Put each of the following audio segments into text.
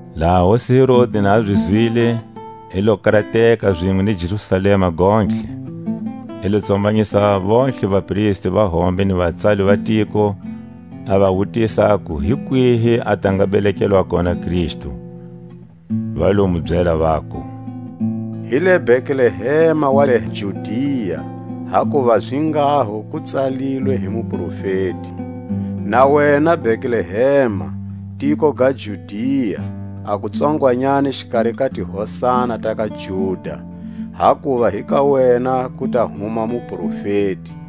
Laha hosi Herodi na zi zwile, i lo karateka zinwe ni Jerusalema gontlhe. I lo tsombanyisa vontlhe vapristi va hombe ni vatsali va tiko, a va wutisa aku hi kwihi a ta nga belekelwa kona Kristu. Va lo mu byela, vaku; Hi le Betlehema wa le Judia; hakuva zinghaho ku tsalilwe hi muprofeti: Na wena Betlehema, tiko ga Juda, A ku tsongwanyani xikari ka ti hosana ta ka Juda; Hakuva hi ka wena ku ta huma mufumeli,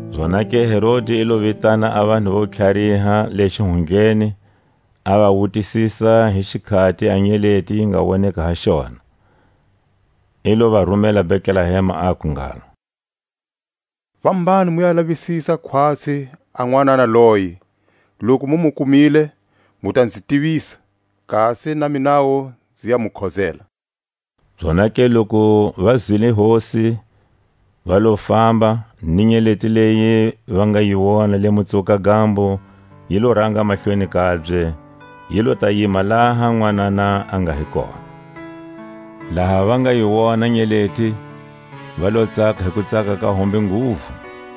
Zonake Herodi i lo vitana a vanhu vo tlhariha le xihundleni, a va wutisisa hi xikhati a nyeleti yi nga woneka ha xona. I lo va rumela Betlehema, aku ngalo: Fambani mu ya lavisisa khwatsi a nwanana loyi; loku mu mu kumile, mu ta nzi tivisa, kasi na minawu nzi ya mu khozela. Zonake loku va zwile hosi, va lo famba, ni nyeleti leyi va nga yi wona le Mutsuwuka-gambo, yi lo ranga mahlweni kabye, yi lo ta yima laha a nwanana a nga hi koha. Laha va nga yi wona nyeleti, va lo tsaka hi kutsaka ka hombe nguvu.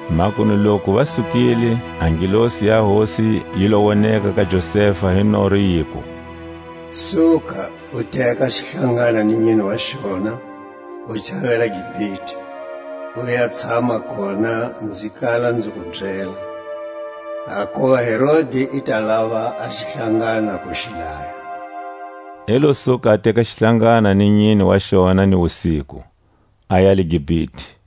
Makunu loku va sukile, a ngelosi ya Hosi yi lo woneka ka Josefa hi noro, yiku: Suka, u teka xihlangana ni nyine wa xona, u chavela Gipite, u ya tshama kona nzi kala nzi ku byela; hakuva Herodi i ta lava a xihlangana ku xi daya. I lo suka a teka xihlangana ni nyine wa xona ni wusiku, aya le Gipite.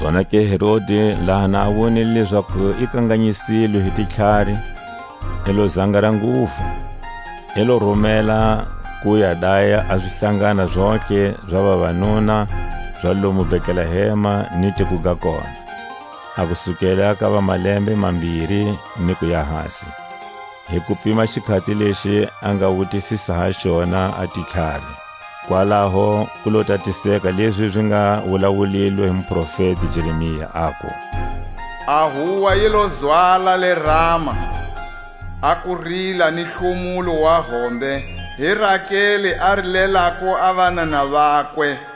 Zonake Herodi laha na a wonile lezaku i kanganyisilwe hi titlhari, i lo zangara nguvu; i lo rumela ku ya daya a zihlangana zontlhe za vavanuna za lomu Betlehema ni tiko ga kona, a ku sukela ka va malembe mambiri nf kuya hasi, hi ku pima xikhati lexi a nga wutisisa ha xona a titlhari. Kwalaho ku lo tatiseka lezi zi nga wulawulilwe hi muprofeti Jeremia, aku: A huwa yi lo zwala le Rama, A kurila ni hlomulo wa hombe; Hi Rakeli a rilelako a vanana vakwe;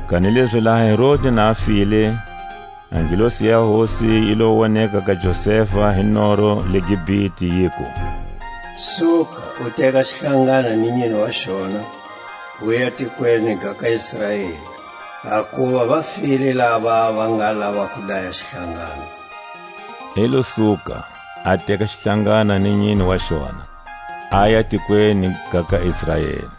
Kanilezi laha Herodi na a file, e ngelosi ya Hosi yi lo woneka ka Josefa hi, noro le Gipite, yiku: Suka, u teka xihlangana ni nyine wa xona, uya tikweni ga ka Israeli; hakuva va file lava va nga lava ku daya xihlangana. I lo suka, a teka xihlangana ni nyine wa xona, aya tikweni ga ka Israeli.